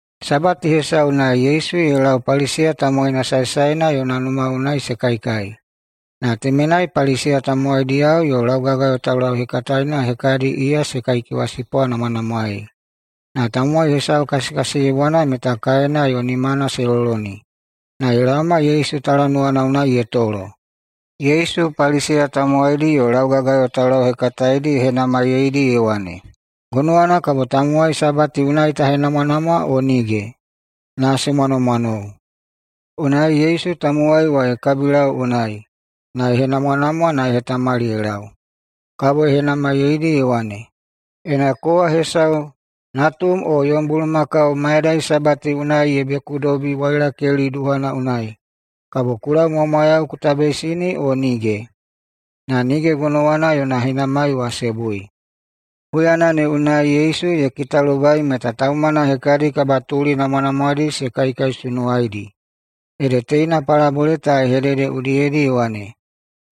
Sabati hesau unai Yesu ye lau Paliseya tamowaina saesaena yona numa unai se kaikai, na temenai Paliseya tamowaidiyao yo laugagayo taulauhekataena hekadi iya se kaikewasipwanamwanamwaei. Na tamowai hesau kasikasiyebwana meta kaena yo nimana se loloni, na ye laoma Yesu talanuwana unai ye tolo. Yesu Paliseya tamowaidi yo laugagayo taulauhekataedi ye henamaiyeidi ye wane, “Gonowana kabo tamowai sabati unai ta henamwanamwa o nige?” Na se mwanomwanou. Unai Yesu tamowai wa ye kabilau unai, na ye henamwanamwa na ye hetamali ye lau. Kabo ye henamaiyeidi ye wane, “Ena kowa hesau natum o yom bulumakau mayadai Sabati unai ye bekudobi wailakeli duhana unai, kabo ku laumwamwayau ku tabeisini o nige?” Na nige gonowana yona henamai wa se bui. Huyana ne unai Yesu ye kitalobai meta taumana hekadi kabatuli namwanamwadi se kaikaisunuwaidi, ede teina palabole ta ye hedede udiyedi na ye wane,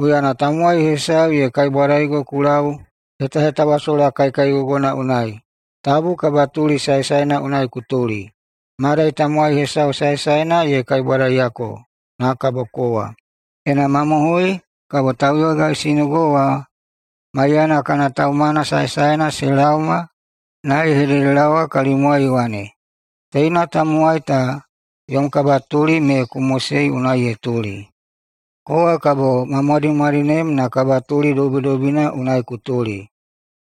“Huyana tamowai hesau ye kaibwadaigo ku lau hetahetawasola kaikaigogona unai, tabu kabatuli saesaena unai ku tuli, madai tamowai hesau saesaena ye kaibwadaiyako na kabo kowa. Ena mamohoi, kabo tauyogaisinigo wa maiyana kana taumana saesaena se laoma na ye hededelaowa kalimwai ye wane, ‘Teina tamowai ta yom kabatuli me ku mosei unai ye tuli.’ Kowa kabo ma mwadimwadinem na kabatuli dobidobina unai ku tuli.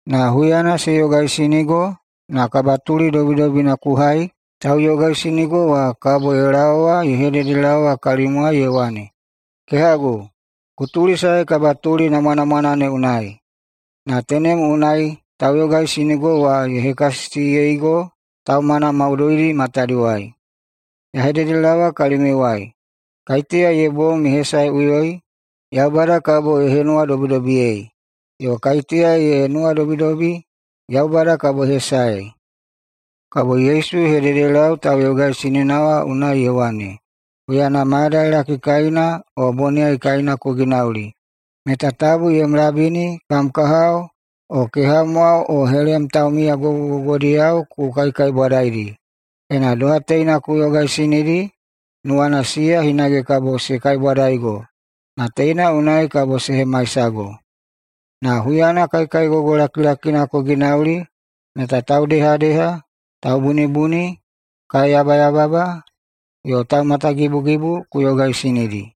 Na huyana se yogaisinigo na kabatuli dobidobina ku hai, tauyogaisinigo wa kabo ye laowa ye hededelaowa kalimwai ye wane, ‘Kehagu, ku tulisae kabatuli namwanamwana ne unai.’ Na tenem unai tauyogaisinigo wa ye hekasisiyeigo taumana maudoidi matadiwai. Ya hededelaowa kalimiuwai: Kaiteya ye bom ye hesaeꞌuyoi, Yaubada kabo ye henuwadobidobiyei, yo kaiteya ye nuwadobidobi, Yaubada kabo ye hesaei.” Kabo Yesu ye hededelau tauyogaisinina wa unai ye wane, “Huyana mayadailaki kaina o boniyai kaina ku ginauli, meta tabu yom labini o kam kahao o kehamwao o helem taumiya gogogogodiyao ku kaikaibwadaidi. Ena doha teina ku yogaisinidi, nuwana siya hinage kabo se kaibwadaigo, na teina unai kabo se hemaisago. Na huyana kaikaigogo lakilakina ku ginauli, meta taudehadeha, taubunibuni, kaeyabayababa yo taumatagibugibu ku yogaisinidi.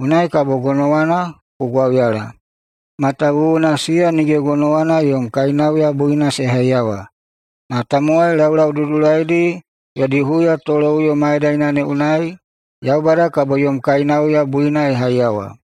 Unai kabo gonowana ku gwauyala, matawuwuna siya nige gonowana yom kainauya buina se haiyawa, na tamowai laulaududulaidi yodi huyatoloꞌuyo mayadaina ne unai Yaubada kabo yom kainauya buina ye haiyawa.”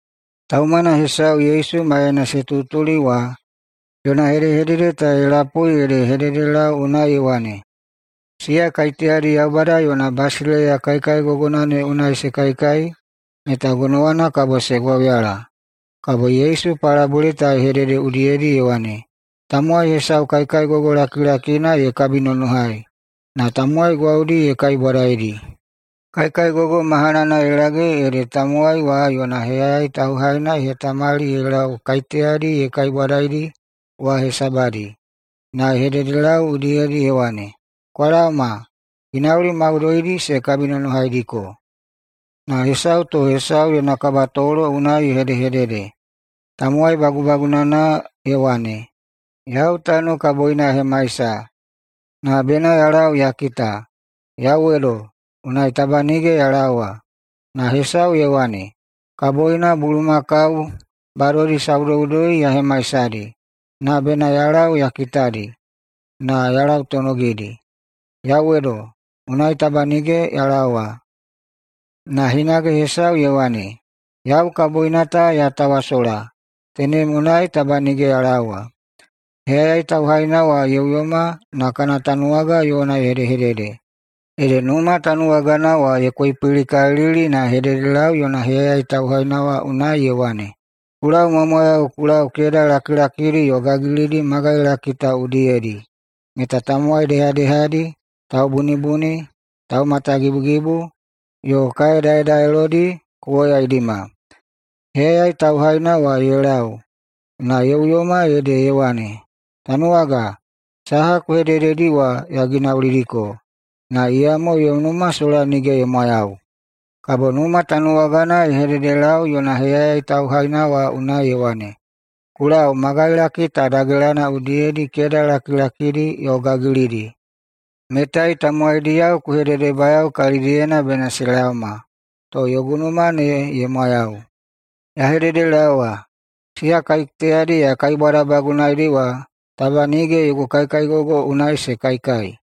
Taumana hesau Yesu maiyana se tutuli wa yona hedehedede ta ye lapui ede ye hededelau unai ye wane, “Siya kaiteyadi Yaubada yona basileiya kaikaigogona ne unai se kaikai meta gonowana kabo se gwauyala.” Kabo Yesu [palabole ta ye hedede udiyedi] ye wane, “Tamowai hesau kaikaigogo lakilakina ye kabinonohai, na tamowai gwaudi ye kaibwadaidi. Kaikaigogo mahanana ye lage, ede tamowai wa yona heyayai tauhaina ye hetamali ye lau kaiteyadi ye kaibwadaidi wa hesabadi na ye hededelau udiyedi ye wane, ‘Kwa laoma, ginauli maudoidi se kabinonohaidiko.’ Na hesau to hesau yona kabatolo unai ye hedehedede. Tamowai bagubagunana ye wane, ‘Yau tano kaboina ya hemaisa, na bena ya lau ya kita. Yauwedo! Unai taba nige ya laowa.’ Na hesau ye wane, ‘Kaboina bulumakau badodi saudoudoi ya hemaisadi, na bena ya lau ya kitadi na ya lautonogidi. Yauwedo! Unai taba nige ya laowa.’ Na hinage hesau ye wane, ‘Yau kaboina ta ya tawasola, tenem unai taba nige ya laowa.’ Heyayai tauhaina wa ye uyoma na kana tanuwaga yona ye hedehedede, ede numa tanuwagana wa ye koipilikalili na ye hededelau yona heyayai tauhaina wa unai ye wane, ‘Ku laumwamwayau ku lau keda lakilakidi yo gagilidi magailaki ta udiyedi meta tamowai dehadehadi, taubunibuni, taumatagibugibu, yo kae daedaelodi ku woyaidima.’ Heyayai tauhaina wa [ye lau, na ye uyoma ede] ye wane, ‘Tanuwaga, saha ku hedededi wa ya ginaulidiko, na iyamo yom numa sola nige ye mwayau.’ Kabo numa tanuwagana ye hededelau yona heyayai tauhaina wa unai ye wane, ‘Ku lau magailaki ta dagelana udiyedi keda lakilakidi yo gagilidi, metai tamowaidiyao ku hededebayao kalidiyena bena se laoma, to yogu numa ne ye mwayau. Ya hededelaowa, siya kaiteyadi ya kaibwadabagunaidi wa taba nige yogu kaikaigogo unai se kaikai.’”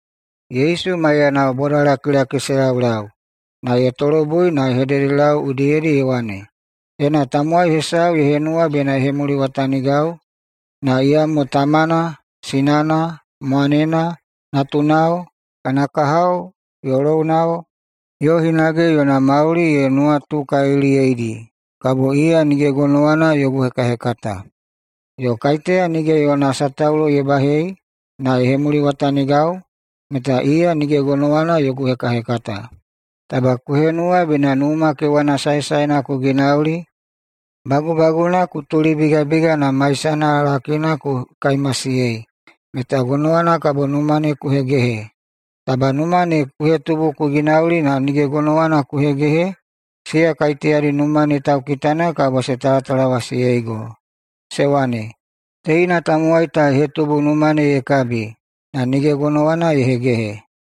Yesu maiyanao bodalakilaki se laulau, na ye tolobui na ye hededelau udiyedi ye wane, “Ena tamowai hesau ye henuwa bena ye hemuliwatanigau, na iyamo tamana, sinana, mwanena, natunao, kana kahao yo lounao, yo hinage yona mauli ye nuwatukaliliyeidi, kabo iya nige gonowana yogu hekahekata. Yo kaiteya nige yona sataulo ye bahei na ye hemuliwatanigau, meta iya nige gonowana yogu hekahekata. Taba ku henuwa bena numa kewana saesaena ku ginauli, bagubaguna ku tulibigabiga na maisana lakina ku kaimasiyei meta gonowana kabo numa ne ku hegehe. Taba numa ne ku hetubu ku ginauli na nige gonowana ku hegehe, siya kaiteyadi numa ne taukitana kabo se talatalawasiyeigo se wane, ‘Teina tamowai ta ye hetubu numa ne ye kabi, na nige gonowana ye hegehe.’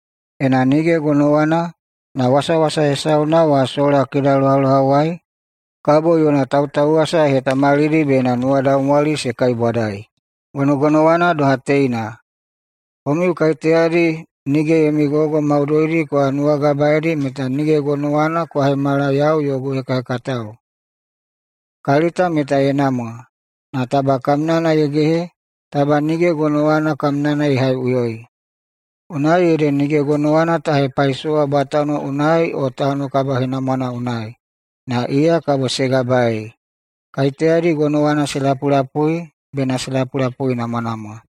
Ena nige gonowana, na wasawasa hesauna wa sola kedalohalohawai, kabo yona tautauwasa ye hetamalidi bena nuwadaumwali se kaibwadai. Gonogonowana doha teina, komiu kaiteyadi nige yomi gogo maudoidi kwa nuwagabaedi meta nige gonowana kwa hemala yau yogu hekahekatao. Kalita meta ye namwa, na taba kamnana ye gehe, taba nige gonowana kamnana ye haiꞌuyoi. Unai ede nige gonowana ta hepaisowa bwatano unai o tano kabahenamwana unai, na iya kabo se gabaei. Kaiteyadi gonowana se lapulapui bena se lapulapuinamwanamwa!”